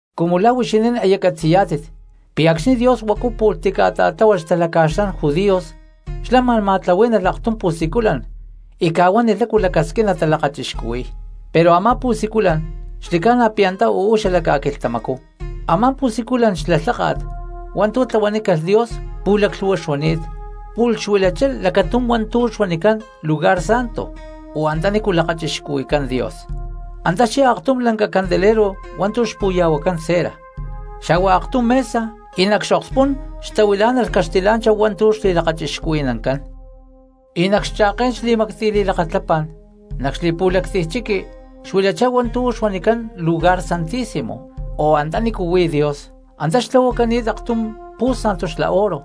Cumu la̠ huixinín aya catzi̠yá̠tit pi̠ acxni̠ Dios huacu pu̠lh tica̠ta̠tláhualh xtalaca̠xlán judios, xlá ma̠n ma̠tlahuí̠nalh aktum pu̠siculan y ca̠huánilh lácu xlacasquín natalakachixcuhuí̠y, pero a̠má pu̠siculan xli̠ca̠na pi̠ antá uú xala ca̠quilhtamacú. Amá pu̠siculan xla lháka̠t hua̠ntu̠ tlahuanícalh Dios pu̠laclhu̠hua xuani̠t, pu̠lh xuilachá lacatum hua̠ntu̠ xuanicán Lugar Santo o Antanícu lakachixcuhui̠cán Dios; antá xyá aktum lanca candelero hua̠ntu̠ xpu̠ya̠huacán cera, xa̠hua aktum mesa y nac xokspú̠n xtahuilá̠nalh caxtilá̠nchahu hua̠ntu̠ xli̠lakachixcuhui̠nancán. Y nac xcha̠ké̠n xli̠mactiy li̠lakatlapá̠n nac xli̠pu̠lactiy chiqui xuilachá hua̠ntu̠ xuanicán Lugar Santísimo, o Antanícu huí Dios. Antá xtlahuacani̠t aktum pu̠santu xla oro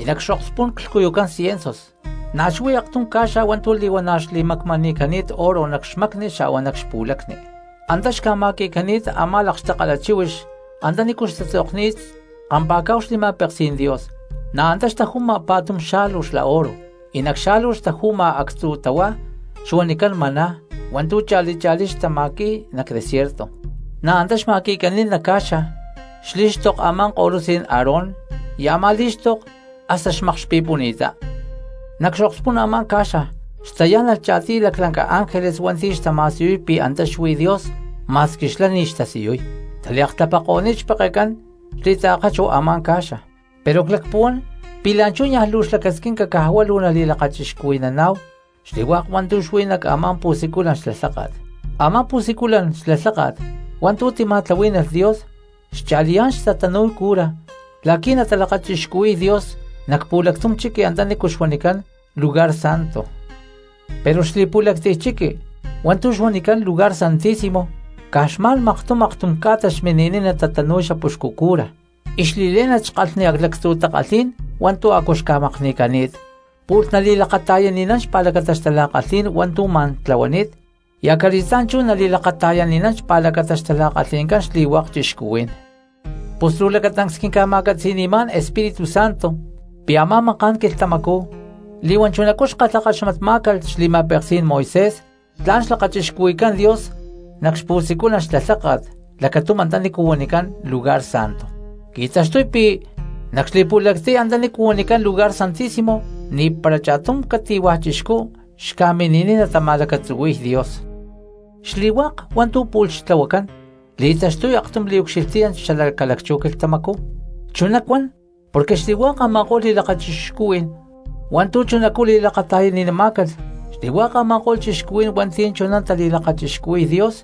y nac xokspú̠n clhcuyucán ciensus, na̠ xuí aktum ca̠xa hua̠ntu̠ li̠huana̠ xli̠macmani̠cani̠t oro nac xmacni xa̠hua nac xpu̠lacni, antá xca̠ma̠qui̠cani̠t a̠má lakxtakala chíhuix antanícu xtatzokni̠t kampa̠cá̠hu xli̠ma̠peksí̠n Dios. Na̠ antá xtaju̠ma pa̠tum xa̠lu xla oro, y nac xa̠lu xtaju̠ma actzu̠ tahuá xuanicán maná hua̠ntu̠ cha̠li cha̠lí xtama̠qui̠y nac desierto. Na̠ antá xma̠qui̠cani̠t nac ca̠xa xlí̠xtok a̠má ko̠lutzí̠n Aarón y a̠má lí̠xtoko hasta xmakxpi̠puni̠ttá. Nac xokspú̠n a̠má ca̠xa xtayá̠nalh cha̠tiy laclanca ángeles hua̠nti̠ xtama̠siyuy pi̠ antá xuí Dios, ma̠squi xlá ni̠ xtasiyuy, xtaliaktlapako̠ni̠t xpekencán xli̠taakachuw a̠má ca̠xa. Pero clacpuhuán pi̠ la̠nchú ni̠ luu xlacasquinca caj huá luu nali̠kalhchuhui̠naná̠hu xli̠hua̠k hua̠ntu̠ xuí nac a̠má pu̠siculan xla lháka̠t. Amá pu̠siculan xla lháka̠t hua̠ntu̠ tima̠tlahuí̠nalh Dios xcha̠liyá̠n xtatanu̠y cura la̠qui̠ natalakachixcuhui̠y Dios nac pu̠lactum chiqui antanícu xuanicán Lugar Santo. Pero xli̠pu̠lactiy chiqui hua̠ntu̠ xuanicán Lugar Santísimo caj xma̠n maktum aktum ca̠ta xmini̠niy natanu̠y xapuxcu cura, y xli̠lé̠nat xkalhni lactzu̠ takalhí̠n hua̠ntu̠ a̠cu xca̠makni̠cani̠t, pu̠lh nali̠lakata̠yani̠nán xpa̠lacata xtala̠kalhí̠n hua̠ntu̠ ma̠n tlahuani̠t y acali̠stá̠n chú nali̠lakata̠yani̠nán xpa̠lacata xtala̠kalhi̠ncán xli̠hua̠k cristianos. Pus luu lacatancs quinca̠ma̠catzi̠ni̠má̠n Espíritu Santo pi̠ a̠má maká̠n quilhtamacú li̠huán chunacú xkalhakaxmatmá̠calh xli̠ma̠peksí̠n Moisés tla̠n xlakachixcuhui̠cán Dios nac xpu̠siculan xla lháka̠t lacatum antanícu huanicán Lugar Santo; qui̠taxtuy pi̠ nac xli̠pu̠lactiy antanícu huanicán Lugar Santísimo ni̠para cha̠tum cati̠hua̠ cristianos xca̠mini̠niy natama̠lacatzuhui̠y Dios. Xli̠hua̠k hua̠ntu̠ pu̠lh xtlahuacán li̠taxtuy aktum liucxilhtiyán xala ca̠lacchú quilhtamacú; chuná cuan porque xli̠hua̠k a̠ma̠ko̠lh li̠lakachixcuhui̠n hua̠ntu̠ chunacú li̠lakata̠yani̠namá̠calh xli̠hua̠k a̠ma̠ko̠lh cristianos hua̠nti̠ chuná tali̠lakachixcuhui̠y Dios,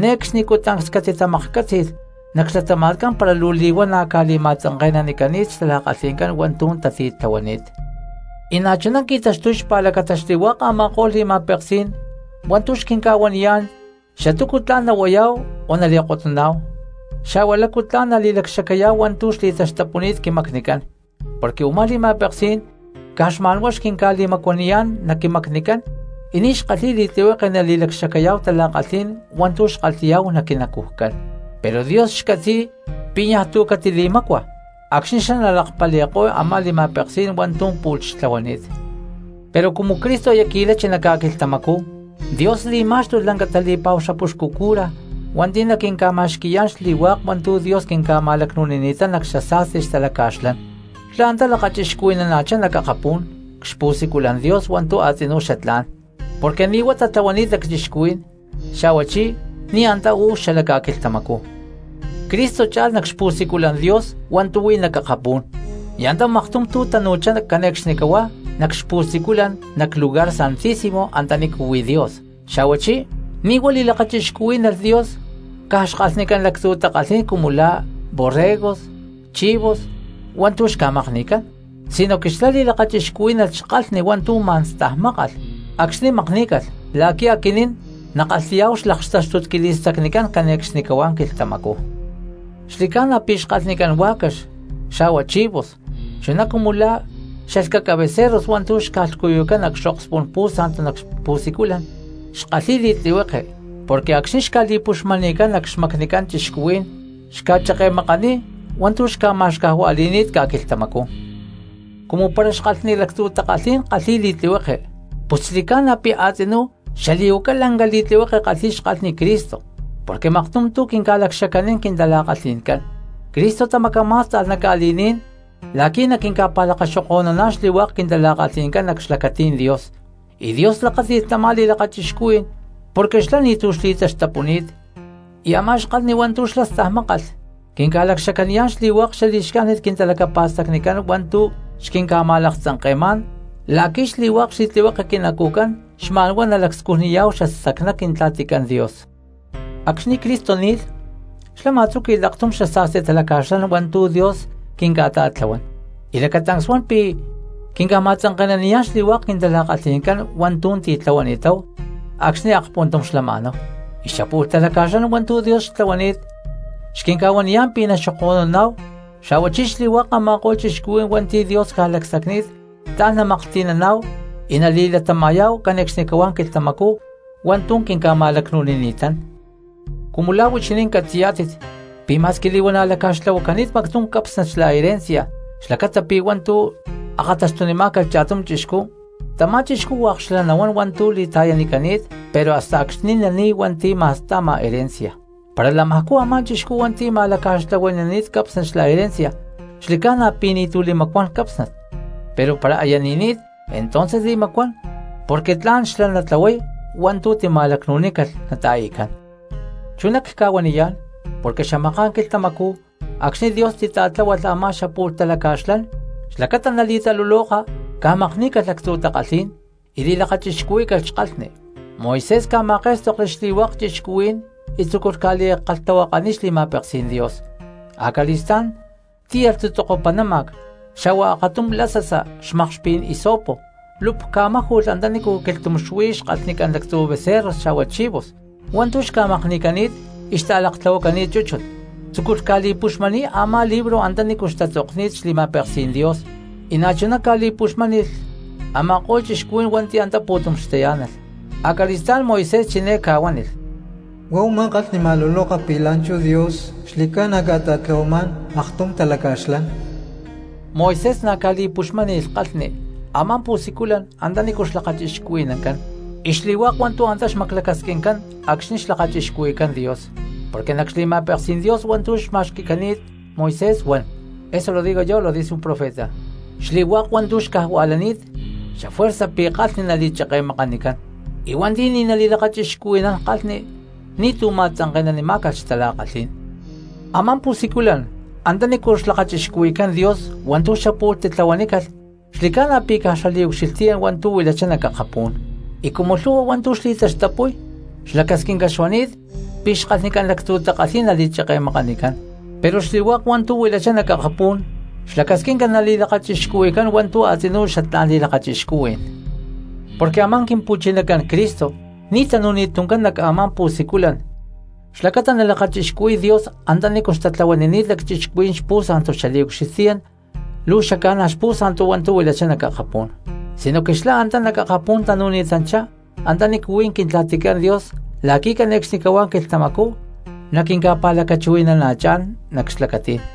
ne̠cxnicú tancs catitali̠maklhcátzi̠lh nac xlatama̠tcán para luu li̠huana̠ ca̠li̠ma̠tzanke̠nanicani̠t xtala̠kalhi̠ncán hua̠ntu̠ tati̠tlahuani̠t. Y na̠chuná qui̠taxtuy xpa̠lacata xli̠hua̠k a̠ma̠ko̠lh li̠ma̠peksí̠n hua̠ntu̠ xquinca̠huaniyá̠n xatúcu tla̠n nahuayá̠hu o nali̠kotnuná̠hu, xa̠hua lácu tla̠n nali̠lacxacayá̠hu hua̠ntu̠ xli̠taxtapuni̠t quimacnicán, porque u̠má li̠ma̠peksí̠n caj xma̠n huá xquinca̠li̠macuaniyá̠n nac quimacnicán y ni̠ xkalhi̠y li̠tlihueke nali̠lacxacayá̠hu tala̠kalhí̠n hua̠ntu̠ xkalhi̠yá̠hu nac quinacujcán, pero Dios xcatzi̠y pi̠ niaj tu̠ catili̠mácua acxni̠ xlá nalakpali̠ko̠y a̠má xli̠ma̠peksí̠n hua̠ntu̠ pu̠lh xtlahuani̠t. Pero cumu Cristo aya qui̠lachi nac ca̠quilhtamacú, Dios li̠má̠xtulh lanca tali̠pa̠hu xapuxcu cura hua̠nti̠ naquinca̠ma̠xqui̠yá̠n xli̠hua̠k hua̠ntu̠ Dios quinca̠ma̠lacnu̠nini̠tán nac xasa̠sti xtalacca̠xlán. Xlá antá lakachixcuhui̠nana̠chá nac akapú̠n cxpu̠siculan Dios hua̠ntu̠ a̠tzinú xatlá̠n, porque ni̠ huá tlahuani̠t lacchixcuhuí̠n, xa̠huachí ni̠ antá uú xala ca̠quilhtamacú. Cristo cha̠lh nac xpu̠siculan Dios hua̠ntu̠ huí nac akapú̠n y antá maktum tu̠ tanu̠chá cane̠cxnicahuá nac xpu̠siculan nac Lugar Santísimo antanícu huí Dios, xa̠huachí ni̠ huá li̠lakachixcúhui̠lh Dios caj xkalhnicán lactzu̠ takalhí̠n cumu la̠ borregos, chivos hua̠ntu̠ xca̠makni̠cán, sinoque xlá li̠lakachixcuhuí̠nalh xkalhni hua̠ntu̠ ma̠n stajmákalh acxni̠ makní̠calh la̠qui̠ aquinín nakalhi̠yá̠hu xlaktáxtut quili̠stacnicán cane̠cxnicahuá quilhtamacú. Xli̠ca̠na pi̠ xkalhnicán huá̠cax xa̠hua chivos chuná cumu lá xalhcaca becerros hua̠ntu̠ xca̠lhcuyucán nac xokspú̠n pu̠santu nac pu̠siculan xkalhi̠y li̠tlihueke porque acxni̠ xca̠li̠puxmani̠cán nac xmacnicán cristianos ca̠cheke̠makanícalh hua̠ntu̠ xca̠ma̠xcajuali̠ni̠t xcuenta ca̠quilhtamacú. Cumu para xkalhnicán lactzu̠ takalhí̠n kalhi̠y li̠tlihueke, ¡pus xli̠ca̠na pi̠ a̠tzinú xali̠huacay lanca li̠tlihueke kalhi̠y xkalhni Cristo porque maktum tu̠ quinca̠lacxacanín quintala̠kalhi̠ncán! Cristo tamacamá̠sta̠lh nac ca̠li̠ní̠n la̠qui̠ naquinca̠pa̠lakaxoko̠nuná̠n xli̠hua̠k quintala̠kalhi̠ncán nac xlacatí̠n Dios, y Dios lakáti̠lh tamá li̠lakachixcuhui̠n porque xlá ni̠tu̠ xli̠taxtapuni̠t; y a̠má xkalhni hua̠ntu̠ xlá stajmákalh quinca̠lacxacaniyá̠n xli̠hua̠k xali̠xcájnit quintalacapa̠stacnicán hua̠ntu̠ xquinca̠ma̠laktzanke̠má̠n la̠qui̠ xli̠hua̠k xli̠tlihueke quinacujcán xma̠n huá nalacscujnaniyá̠hu xastacná Quintla̠ticán Dios. Acxni̠ Cristo ni̠lh xlá ma̠tzúqui̠lh aktum xasa̠sti talaca̠xlán hua̠ntu̠ Dios quinca̠ta̠tlahuán, y lacatancs huan pi̠ quinca̠ma̠tzanke̠naniyá̠n xli̠hua̠k quintala̠kalhi̠ncán hua̠ntu̠ titlahuani̠táhu acxni̠ akpuntum xlama̠náhu, y xapu̠lh talaca̠xlán hua̠ntu̠ Dios xtlahuani̠t xquinca̠huaniyá̠n pi̠ naxoko̠nuná̠hu, xa̠huachí xli̠hua̠k a̠ma̠ko̠lh cristianos hua̠nti̠ Dios ca̠lacsacni̠t tla̠n namaklhti̠naná̠hu y nali̠latama̠yá̠hu cane̠cxnicahuá quilhtamacú hua̠ntu̠ quinca̠ma̠lacnu̠nini̠tán. Cumu la̠ huixinín catzi̠yá̠tit pi̠ ma̠squi li̠huana̠ laca̠xtlahuacani̠t mactum cápsnat xla herencia xlacata pi̠ hua̠ntu̠ akata̠xtunimá̠calh cha̠tum chixcú, tamá chixcú hua̠k xlá nahuán hua̠ntu̠ li̠ta̠yanicani̠t pero hasta acxni̠ nani̠y hua̠nti̠ ma̠sta̠ma herencia. Para lamajcú a̠má chixcú hua̠nti̠ ma̠laca̠xtlahuani̠nani̠t cápsnat xla herencia xli̠ca̠na pi̠ ni̠tu̠ li̠macuán cápsnat, pero para aya ni̠ni̠t entonces li̠macuán porque tla̠n xlá natlahuay hua̠ntu̠ tima̠lacnu̠nícalh nata̠i̠cán. Chuná cca̠huaniyá̠n porque xamaká̠n quilhtamacú acxni̠ Dios titláhualh a̠má xapu̠lh talaca̠xlán, xlacata nali̠taluloka ca̠makní̠calh lactzu̠ takalhí̠n y li̠lakachixcuhuí̠calh xkalhni. Moisés ca̠ma̠ké̠stokli xli̠hua̠k cristianos y tzúculh ca̠li̠kalhtahuakaniy xli̠ma̠peksí̠n Dios; acali̠stá̠n tíyalh tzutzoko panáma̠c xa̠hua akatum lasasa xmakxpí̠n hisopo, lup ca̠máju̠lh antanícu quilhtum xuí xkalhnicán lactzu̠ becerros xa̠hua chivos hua̠ntu̠ xca̠makni̠cani̠t y xta̠laktlahuacani̠t chúchut, tzúculh ca̠li̠puxmani̠y a̠má libro antanícu xtatzokni̠t xli̠ma̠peksí̠n Dios, y na̠chuná ca̠li̠puxmáni̠lh a̠ma̠ko̠lh cristianos hua̠nti̠ antá pu̠tum xtayá̠nalh. Acali̠stá̠n Moisés chiné ca̠huánilh: “Huá u̠má kalhni ma̠luloka pi̠ la̠nchú Dios xli̠ca̠na ca̠ta̠tlahuamá̠n aktum talaca̠xlán.” Moisés na̠ ca̠li̠puxmáni̠lh kalhni a̠má pu̠siculan antanícu xlakachixcuhui̠nancán y xli̠hua̠k hua̠ntu̠ antá xmaclacasquincán acxni̠ xlakachixcuhui̠cán Dios. Porque nac xli̠ma̠peksí̠n Dios hua̠ntu̠ xma̠xqui̠ni̠t Moisés huan: “Xli̠hua̠k hua̠ntu̠ xcajua̠lani̠t xafuerza pi̠ kalhni nali̠cheke̠makanicán, y hua̠nti̠ ni̠ nali̠lakachixcuhui̠nán kalhni ni̠tu̠ ma̠tzanke̠nanimá̠calh xtala̠kalhí̠n.” Amá pu̠siculan antanícu xlakachixcuhui̠cán Dios hua̠ntu̠ xapu̠lh titlahuanícalh xli̠ca̠na pi̠ caj xaliucxilhtiyán hua̠ntu̠ huilachá nac akapú̠n, y cumu lhu̠hua hua̠ntu̠ uú xli̠taxtapuy xlacasquinca xuani̠t pi̠ xkalhnicán lactzu̠ takalhí̠n nali̠cheke̠makanicán; pero xli̠hua̠k hua̠ntu̠ huilachá nac akapú̠n xlacasquinca nali̠lakachixcuhui̠cán hua̠ntu̠ a̠tzinú xatlá̠n li̠lakachixcuhui̠n. Porque a̠má Quimpu̠chinacán Cristo ni̠ tanu̠ni̠t tuncán nac a̠má pu̠siculan xlacata nalakachixcuhui̠y Dios antanícu xtatlahuanini̠t lacchixcuhuí̠n xpu̠sa̠ntu, xaliucxilhtiyán luu xaca̠na̠ xpu̠sa̠ntu hua̠ntu̠ huilachá nac akapú̠n, sinoque xlá antá nac akapú̠n tanu̠ni̠tanchá antanícu huí Quintla̠ticán Dios la̠qui̠ cane̠cxnicahuá quilhtamacú naquinca̠pa̠lacachuhui̠nana̠chá̠n nac xlacatí̠n.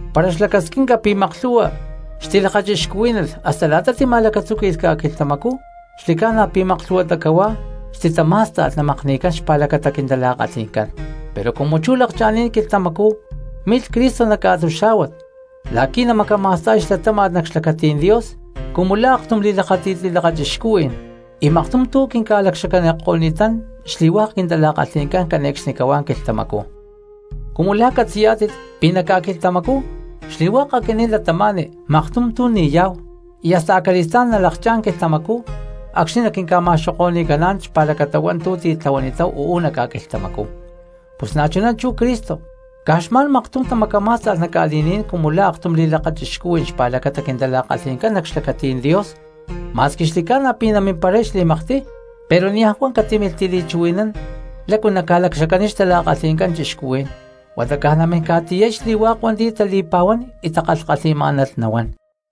Para xlacasquinca pi̠ maklhu̠hua xtilakachixcuhuí̠nalh, hasta la̠ta tima̠lacatzuquí̠calh ca̠quilhtamacú xli̠ca̠na pi̠ maklhu̠huatá cahuá xtitamá̠sta̠lh namakni̠cán xpa̠lacata quintala̠kalhi̠ncán; pero cumu chú lakcha̠ni̠t quilhtamacú milh Cristo nac ca̠quilhtamacú la̠qui̠ namacama̠sta̠y xlatáma̠t nac xlacatí̠n Dios cumu la̠ aktum li̠maakxtakájni̠t li̠lakachixcuhui̠n y maktum tu̠ quinca̠lacxacaniko̠ni̠tán xli̠hua̠k quintala̠kalhi̠ncán cane̠cxnicahuá quilhtamacú. Cumu la̠ catzi̠yá̠tit pi̠ nac ca̠quilhtamacú xli̠hua̠k aquinín cristianos maktum tu̠ ni̠yá̠hu y hasta acali̠stá̠n nalakchá̠n quilhtamacú acxni̠ naquinca̠ma̠xoko̠ni̠caná̠n xpa̠lacata hua̠ntu̠ titlahuani̠táhu uú nac ca̠quilhtamacú, pus na̠chuná chú Cristo caj xma̠n maktum tamacamá̠sta̠lh nac ca̠li̠ní̠n cumu la̠ aktum li̠lakachixcuhui̠n xpa̠lacata quintala̠kalhi̠ncán nac xlacatí̠n Dios. Ma̠squi xli̠ca̠na pi̠ namimparay xli̠maktiy, pero niaj huá catímilh tili̠chuhui̠nán lácu naca̠lacxacaniy xtala̠kalhi̠ncán cristianos, huata caj namín ca̠tiyay xli̠hua̠k hua̠nti̠ tali̠pa̠huán y takalhkalhi̠má̠nalh nahua̠n.